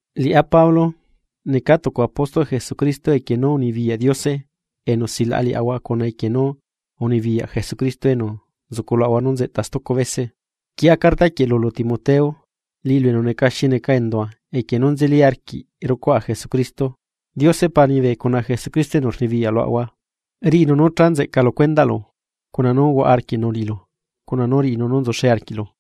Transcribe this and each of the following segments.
Liꞌá Pablo, neca tucu apóstolꞌ Jesucristo equie nú unibiyaꞌ Diose enu silaꞌa liaꞌahua cuna equie nú unibiyaꞌ Jesucristo enu nzuculuaꞌahua nú nzeꞌta stucu bese. Quieꞌa carta quieꞌ lulu Timoteo, liꞌilu enu neca xi neca endua equie nú nzeli arquiꞌ rucuaꞌa Jesucristo, Diose Pa liñibe cuna Jesucristo enu rnibiyaꞌ luaꞌahua riꞌinu nú cha nzeꞌca lu cuendaꞌlu, cuna nú huaꞌa arquiꞌnu liꞌilu cuna nú riꞌinu nú nzuxe arquiꞌlu.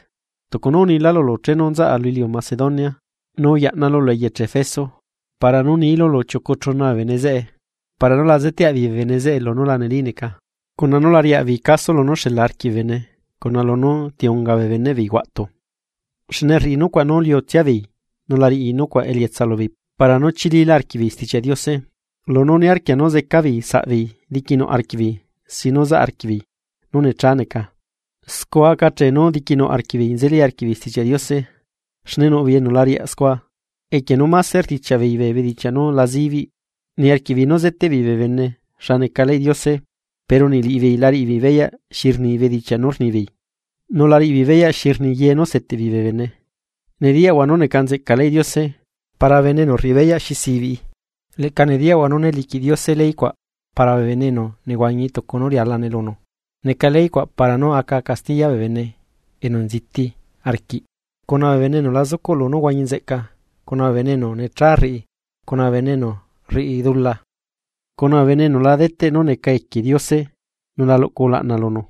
Tucu nú unilá lulu chenu nzaꞌa lu iliu Macedonia, nú yaꞌnalu lu eyeche Efeso, para nú nilu lu chiucu chuna bee bene zeꞌe para nú la zeteaꞌ beei bee bene lunú la neli neca, cuna nú la riaꞌ beei caso lunú xela arquiꞌ bee bene cuna lunú ti unga bee beneꞌ beei huaꞌtu. Xne rriꞌi nucuaꞌ nú liutsia beei nu la riꞌi nucuaꞌ elietsa lubeei para nú chililá arquiꞌbeei Stichiaꞌ Diose. Lunú niarquia nú zeca beei bee saꞌbeei diquinuꞌ arquiꞌbeei sin nú zaꞌ arquiꞌbeei nú necha neca, scua aca ache nú diquinuꞌ arquiꞌbeei nzeli arquiꞌbeei Stichiaꞌ Diose. Xne nuꞌ beei enu la riaꞌ scua, equie nú máse rdichiaꞌ beei bee bedichiaꞌ nú la zibiꞌ. Niarquiꞌ beei nú zeteꞌ beei bee bene xa neca leyꞌ Diose, pero niꞌ liꞌibeei la riꞌibeei beyaꞌ xi rni bedichiaꞌ nú rnibeei, nu la riꞌibeei beyaꞌ xi rni ye nú seteꞌbeei bee bene. Nediyaꞌahua nú neca nzeꞌca leyꞌ Diose, para bene enu rriꞌi beyaꞌ xi sibiꞌi. Leꞌca nediyaꞌahua nú né liquiꞌ Diose ley cuaꞌ para bee bene enu nehuañi tucu nú rialane lunu. Neca ley cuaꞌ para nú aca castiya bee bene enu nziti arquiꞌ cuna bee bene enu la zucuꞌlu nú huañi nzeꞌca, cuna bee bene enu necha rriꞌi cuna bee bene enu rriꞌi dula, cuna bee bene enu la deteꞌ nú neca equie Diose nu la luꞌcu ulaꞌna lunu,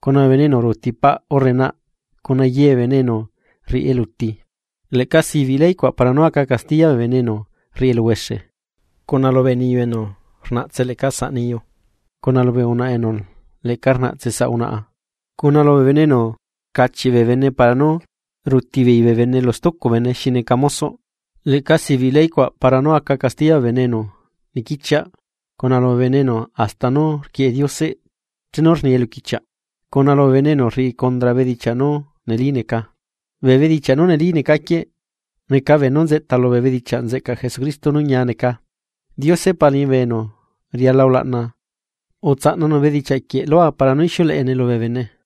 cuna bee bene enu ruuti paꞌ urre naꞌ, cuna ye bee bene enu rriꞌi eluti. Leꞌca sibiꞌ ley cuaꞌ para nú aca castiya bee bene enu rriꞌi eluhuexe, cuna lubee niyu enu rnaꞌtse leꞌca saꞌ niyu, cuna lubee unaꞌa enu leꞌca rnaꞌtse saꞌ unaꞌa, cuna lubee bene enu rcachiꞌ bee bene para nu ruti beei bee bene lu stucu bene xi neca mosoꞌ. Leꞌca sibiꞌ ley cuaꞌ para nu aca castiya bee bene enu niquichiaꞌ, cuna lubee bene enu hasta nú rquieꞌe Diose chenu rni eluquichiaꞌ, cuna lubee bene enu rriꞌi condra bedichiaꞌ nú neli neca. Bee bedichiaꞌ nú neli neca quieꞌ, neca beenú nzeꞌta lubee bedichiaꞌ nzeꞌcaꞌ Jesucristo nú ñia neca. Diose Pa liñibe enu riala ulaꞌna utsaꞌnanu bedichiaꞌ quieꞌ lua para nú ixiuleꞌene lubee bene.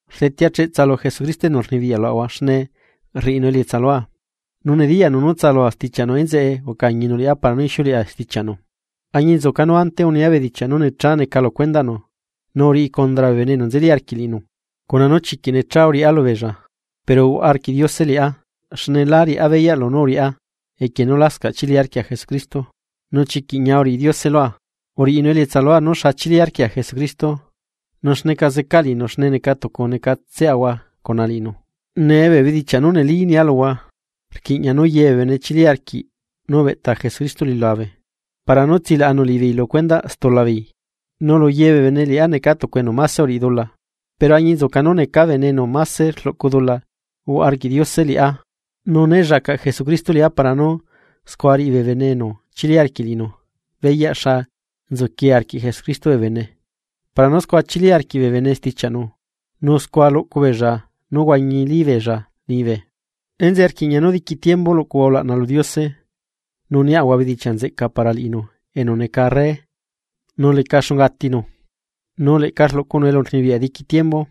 Rdetea cheꞌtsa lu Jesucristo enu rnibiyaꞌ luaꞌahua, xne rriꞌinu elietsa lua, nu nediyaꞌnu nú tsalua stichiaꞌnu enzeꞌe ucañinu liꞌá para nú ixiuleꞌa stichiaꞌnu, añinzuca nú ante unia bedichiaꞌ nú necha neca lu cuendaꞌnu, nu uriꞌi condra bee bene enu nzeli arquiꞌ liꞌinu, cuna nú chiquiꞌ necha uriꞌá lubeella. Pero uhuaꞌa arquiꞌ Diose liꞌá, xne lá riꞌá beyaꞌ lunú uriꞌá equie nú lascaꞌ chili arquia Jesucristo. Nu chiquiꞌ ñia uriꞌi Diose lua, uriꞌinu elietsa lua nú xa chili arquia Jesucristo, nu xneca zeca liꞌinu xne neca tucu necatseꞌahua cuna liꞌinu. Nee bee bedichiaꞌ nú neli nia luhua, rquiꞌña nú ye bee bene chili arquiꞌ nú ubeꞌta Jesucristo lu iliulabe para nú tsilaꞌanu liꞌibeei lu stula beei, nu lu ye bee bene liꞌá neca tucu enu máse uriꞌi dula. Pero añinzuca nú necaa bene enu máse rluꞌcu dula, uhuaꞌa arquiꞌ Diose liꞌá nu né llacaꞌ Jesucristo liꞌá para nu scua riꞌi bee bene enu chili arquiꞌ liꞌinu beyaꞌ xa nzuquie arquiꞌ Jesucristo bee bene para nú scua chili arquiꞌ bee bene stichiaꞌnu, nu scua luꞌcu beella nú huañili beella liñibe. ¡Enzeꞌe rquiꞌña nú diqui tiembu luꞌcuaꞌahua ulaꞌna lu Diose, nu niaꞌahua bedichiaꞌ nzeꞌca para liꞌinu enu neca Arre nu leca xunga atinu, nu leꞌca rluꞌcunu elurnibiyaꞌ diqui tiembu,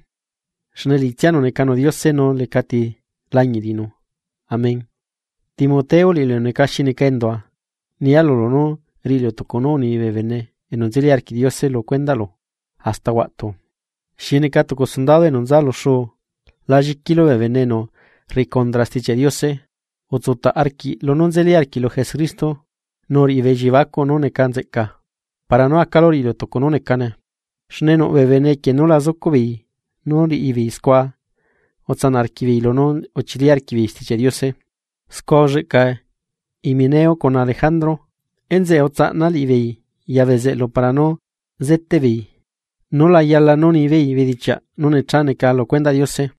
xne liꞌitsianu necanu Diose nu lecati lañiꞌ liꞌinu! Amén. Timoteo liꞌilu enu neca xi neca endua, nia lulu nú riꞌilu tucu nú uni bee bene enu nzeli arquiꞌ Diose lu cuendaꞌlu hasta huaꞌtu, xi neca tucu sundado enu nza lu xuu la lliquilu bee bene enu rriꞌi condra Stichiaꞌ Diose. Utsutaꞌ arquiꞌ lunú nzeli arquiꞌlu Jesucristo, nu uriꞌi bee elliebacuꞌ nú neca nzeꞌca para nú acalu riꞌilu tucu nú necane. Xne nuꞌ bee bene equie nú lá zucuꞌ beei nú riꞌi beei scua utsanaꞌ arquiꞌbeei lunú uchili arquiꞌbeei Stichiaꞌ Diose. Scua ulleꞌca Himeneo cuna Alejandro, enzeꞌe utsaꞌna liꞌibeei ya bezeꞌlu para nú zeteꞌ beei nú la yala nú nibeei bedichiaꞌ nú necha neca lu cuendaꞌ Diose.